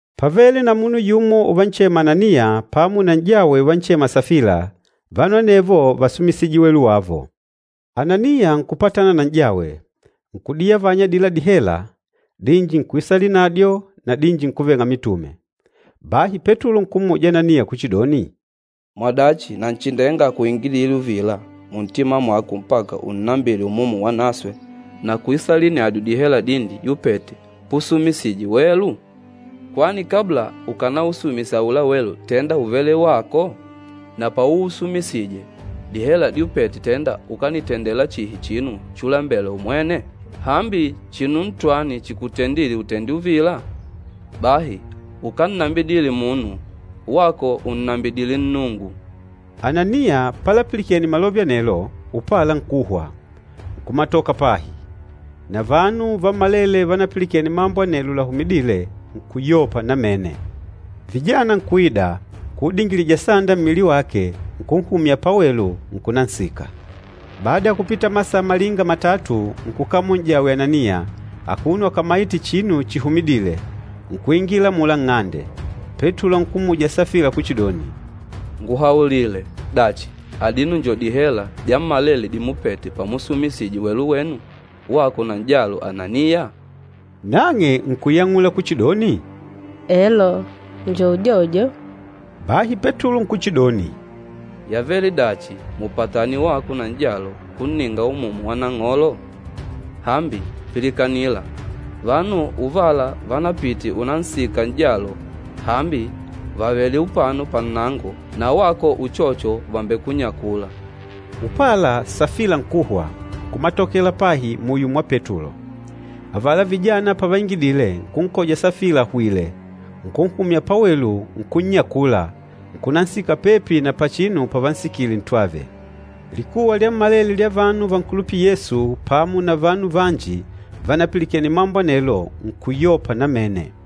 Pávele na munu yumo uvanchema Ananiya pamo na n'jawe uvanchema Safila, vanu anevo vásumisije welu wavo. Ananiya nkupatana na n'jawe, nkudiyavanya adila dihela, dinji nkuisalinadyo na dinji nkuveng'a mitume. Bahi Petulo nkummuja Ananiya kuchidoni, “Mwadachi Nanchindenga ákuingidile uvila muntima mwako mpaka unnambile Umumu Wanaswe na kuisalinadyo dihela dinji dyupete pusumisije welu? Kwani kabla ukanausumisa aula welu tenda úvele wako? Na pauusumisije, dihela dyupete tenda ukanitendela chihi chinu chulembela umwene? Hambi chinu ntwani chikutendîle utende uvila? Bahi ukánnambidile munu, wako ùnnambidile Nnungu!” Ananiya palapilikene malove anelo, upala nkuhwa, nkumatoka pahi. Na vanu vammalele vanapilikene mambo anelo lahumidîle, nkuyopa namene. Vijana nkuida, nkuudingilija sanda mmili wake, nkunhumya pawelu, nkunansika. Bada ya kupita masaa malinga matatu, nkukamola n'jawe Ananiya, akuno akamaìtè chinu chihumidîle, nkuingila amula nng'ande. Petulo nkummuja Safila kuchidoni, “Nguhaulile! Dachi, adino njo dihela dyammalele dimupete pamusumisije welu wenu, wako na n'jalo Ananiya?” Nang'e nkuyang'ula kuchidoni, “Elo, njo udyodyo.” Bahi Petulo nkuchidoni, “Yavele dachi mupatane wako na n'jalo kunninga Umumu wa Nang'olo? Hambi pilikanila, vanu uvala vanapite unansika n'jalo, hambi vàvele upano pannango na wako uchocho vàmbekunyakula.” Upala Safila nkuhwa, nkumatokela pahi muyo mwa Petulo. Avala vijana pavaingidile, nkunkoja Safila ahwìlè, nkunhumya pawelu, nkunnyakula, nkunansika pepi na pachinu pavansikile ntwave. Likuwa lyammalele lya vanu vankulupîla Yesu pamo na vanu vanji vanapilikene mambo anelo nkuyopa namene.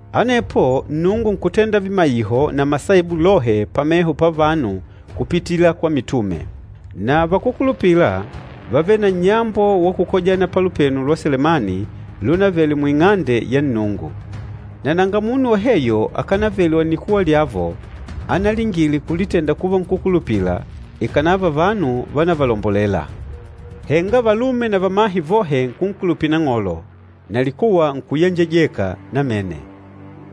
Anepo Nnungu nkutenda vimaiho na masaibu lohe pameho pavanu kupitila kwa mitume. Na vakúkulupila vávele na nnyambo wa kukojana pa Lupenu lwa Selemani lunavele mu Ing'ande ya Nnungu. Na nanga munu woheyo akanavele wa nnikuwa lyavo analingile kulitenda kuva nkúkulupila, ikànava vanu vánavalombolela. Henga valume na vamahe vohe nkunkulupila Nang'olo, na likuwa nkuyenjejeka namene.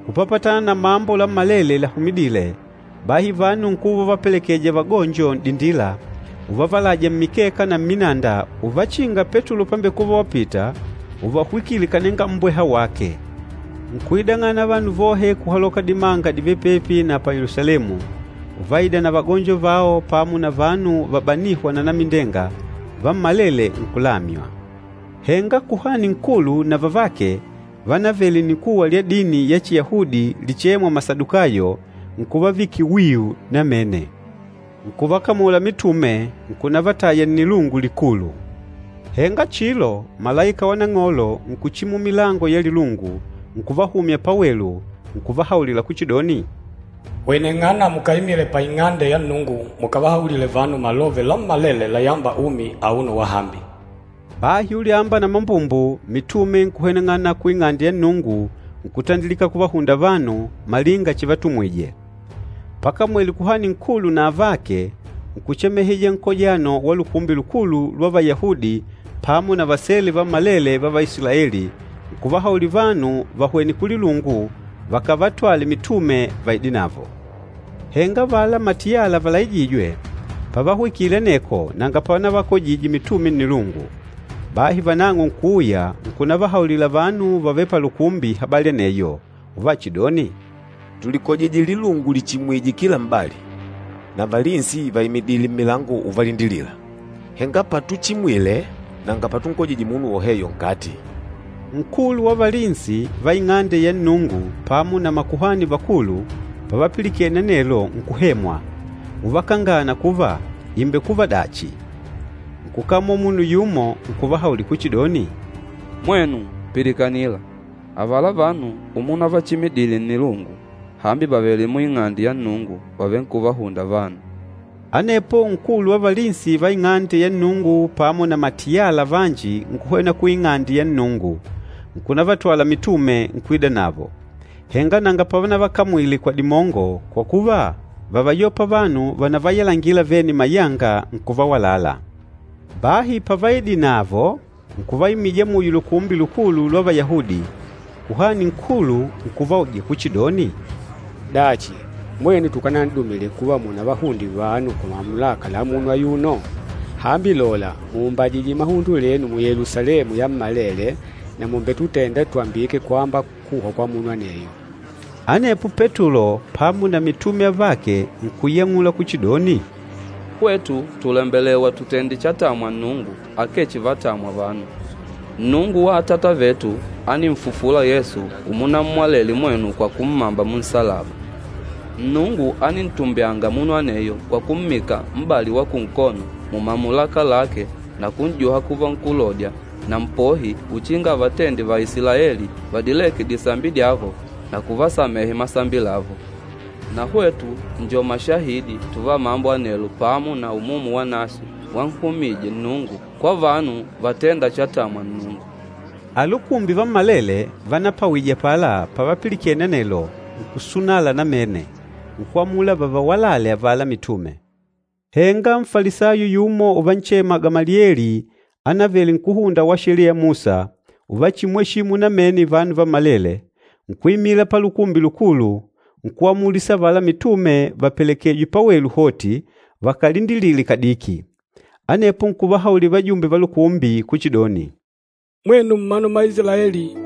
Kupapatana na mambo lammalele lahumidîle, bahi vanu nkuva uvavapelekeja vagonjo n'dindila, uvavalaja mmikeka na mminanda uvachinga Petulo pambekuva wapita, uvahwikile kananga mmbweha wake. Nkuidang'ana vanu vohe kuhaloka dimanga divêle pepi na pa Yelusalemu, uvaida na vagonjo vao pamo na vanu vabanîhwa na anamindenga, vammalele nkulamywa. Henga Kuhani Nkulu na vavake vánavele nnikuwa lya dini ya Chiyahudi lichêmwa Masadukayo, nkuvavikila wiu namene. Nkuvakamula mitume, nkunavataya nnilungu likulu. Henga chilo, malaika wa Nang'olo nkuchimula milango ya lilungu, nkuvahumya pawelu, nkuvahaulila kuchidoni, “Hweneng'ana mukaimile pa Ing'ande ya Nnungu mukavahaulile vanu malove lammalele layâmba umi auno wahambi” Bahi ulyamba na mambumbu mitume nkuhweneng'ana ku Ing'ande ya Nnungu nkutandilika kuvahunda vanu, malinga chivatumwije. Pakamwele Kuhani Nkulu na avake, nkuchemeheja nkojano wa Lukumbi Lukulu lwa Vayahudi pamo na vasele vammalele va Vaisilaeli, nkuvahaulila vanu vahwene kulilungu vakavatwale mitume vaidenavo. Henga avala matiyala valaijîjwe, pavahwikile aneko nanga pavanavakojije mitume nnilungu. Bahi vanang'o nkuuya, nkunavahaulila vanu vavêle palukumbi habali aneyo, uvachidoni, “Tulikojije lilungu lichimwìjè kila m'bali, na valinsi vaimidìlè mmilango uvalindilila. Henga patuchimwile nanga patunkojije munu woheyo nkati.” Nkulu wa valinsi va Ing'ande ya Nnungu pamo na makuhani vakulu pavapilikene anelo nkuhemwa, uvakangana kuva ìmbekuva dachi. Nkukamola munu yumo nkuvahaulila kuchidoni, “Mwenu, pilikanila! Avala vanu amunavachimidile nnilungu, hambi vàvele mu Ing'ande ya Nnungu vàvenkuvahunda vanu.” Anepo nkulu wa valinsi va Ing'ande ya Nnungu pamo na matiyala vanji nkuhwena ku Ing'ande ya Nnungu, nkunavatwala mitume, nkuidanavo. Henga nanga pavanavakamwile kwa dimongo, kwa kuva vávayopa vanu vanavayalangila vene mayanga nkuvawalala. Bahi pavaidinavo, nkuvaimija muyo Lukumbi Lukulu lwa Vayahudi, Kuhani Nkulu nkuvauja kuchidoni, “Dachi, mwenu tukanan'dumile kuva munavahunde vanu kwa mamulaka la munu ayuno? Hambi lola, mùumbajije mahundo lenu Yelusalemu yammalele na mùmbetutenda twambike kwamba kuhwa kwa munu aneyo.” Anepo Petulo pamo na mitume avake nkuyang'ula kuchidoni, “Hwetu tùlembelewa tutende chatamwa Nnungu akee chivatamwa vanu. Nnungu wa atata vetu áninfufula Yesu umunammwalele mwenu kwa kummamba munsalaba. Nnungu ánintumbyanga munu aneyo kwa kummika m'bali wa kunkono mumamulaka lake na kun'juha kuva Nkulodya na Mpohi uchinga avatende Vaisilaeli vadileke disambi dyavo na kuvasamehe masambi lavo. Na hwetu njo mashahidi tuva mambo anelo pamo na Umumu Wanaswe wanhumije Nnungu kwa vanu vatênda chatamwa Nnungu.” Alukumbi vammalele vanapawije apala pavapilikene anelo, nkusunala namene, nkwamula vavawalale avala mitume. Henga Nfalisayo yumo uvanchema Gamalieli anavele nkúhunda wa Sheliya ya Musa, uvachimwesimu namene vanu vammalele, nkuimila pa Lukumbi Lukulu, nkuamulisa avala mitume vapelekejwe pawelu hoti vakalindilile kadiki. Anepo nkuvahaulila vajumbe va Lukumbi kuchidoni, “Mwenu mmanu mma Isilaeli,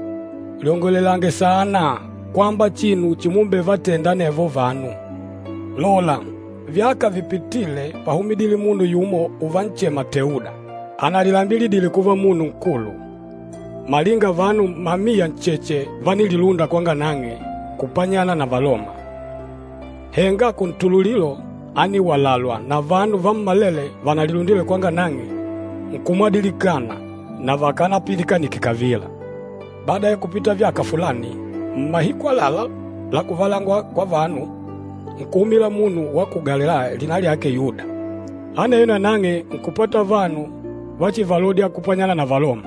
lyongolelange saana kwamba chinu chimumbevatenda anevo vanu! Lola, vyaka vipitîle pahumudile munu yumo uvanchema Teuda, analilambilidile kuva munu nkulu. Malinga vanu mamiya ncheche vánililunda kwanga nang'e kupanyana na Valoma. Henga kuntululilo ániwalalwa, na vanu vammalele vanalilundile kwanga nan'ge nkumwadilikana na vakanapilikanike kavila. Bada ya kupita vyaka fulani, mmahiku àlalá la kuvalangwa kwa vanu, nkuhumila munu wa ku Galilaya lina lyake Yuda. Aneyo nanang'e nkupata vanu vachivalodya kupanyana na Valoma.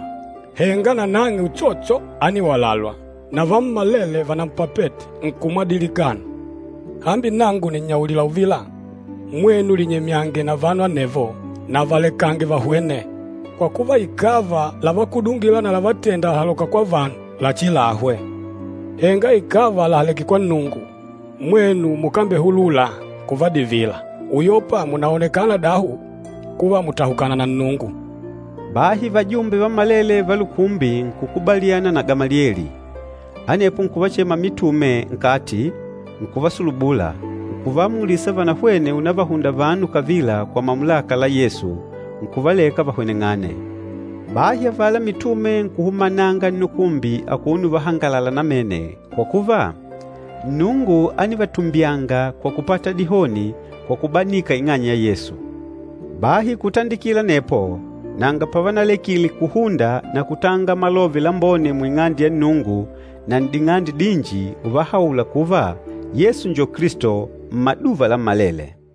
Henga nanang'e uchocho ániwalalwa, na vammalele vanampapete nkumwadilikana. Hambi nangu nìnnyaulila uvila, mwenu linyemyange na vanu anevo na valekange vahwene. Kwa kuva, ikàva lavakudungila na lavalatenda làhaloka kwa vanu lachilahwe. Henga ikàva làhaleke kwa Nnungu, mwenu mukambehulula kuvadivila, uyopa munaonekana dahu kuva mùtahukana na Nnungu.” Bahi vajumbe vammalele va lukumbi nkukubaliana na Gamalieli. Anepo nkuvachema mitume nkati, nkuvasulubula, nkuvaamulisa vanahwene unavahunda vanu kavila kwa mamulaka la Yesu, nkuvaleka vahweneng'ane. Bahi avala mitume nkuhumananga nnukumbi akuno uvahangalala namene, kwa kuva, Nnungu ánivatumbyanga kwa kupata dihoni kwa kubanika ing'anya ya Yesu. Bahi kutandikila anepo nanga pavanalekile kuhunda na kutanga malove lambone mu Ing'ande ya Nnungu na n'ding'ande dinji uvahaula kuva Yesu njo Kilisto, mmaduva lammalele.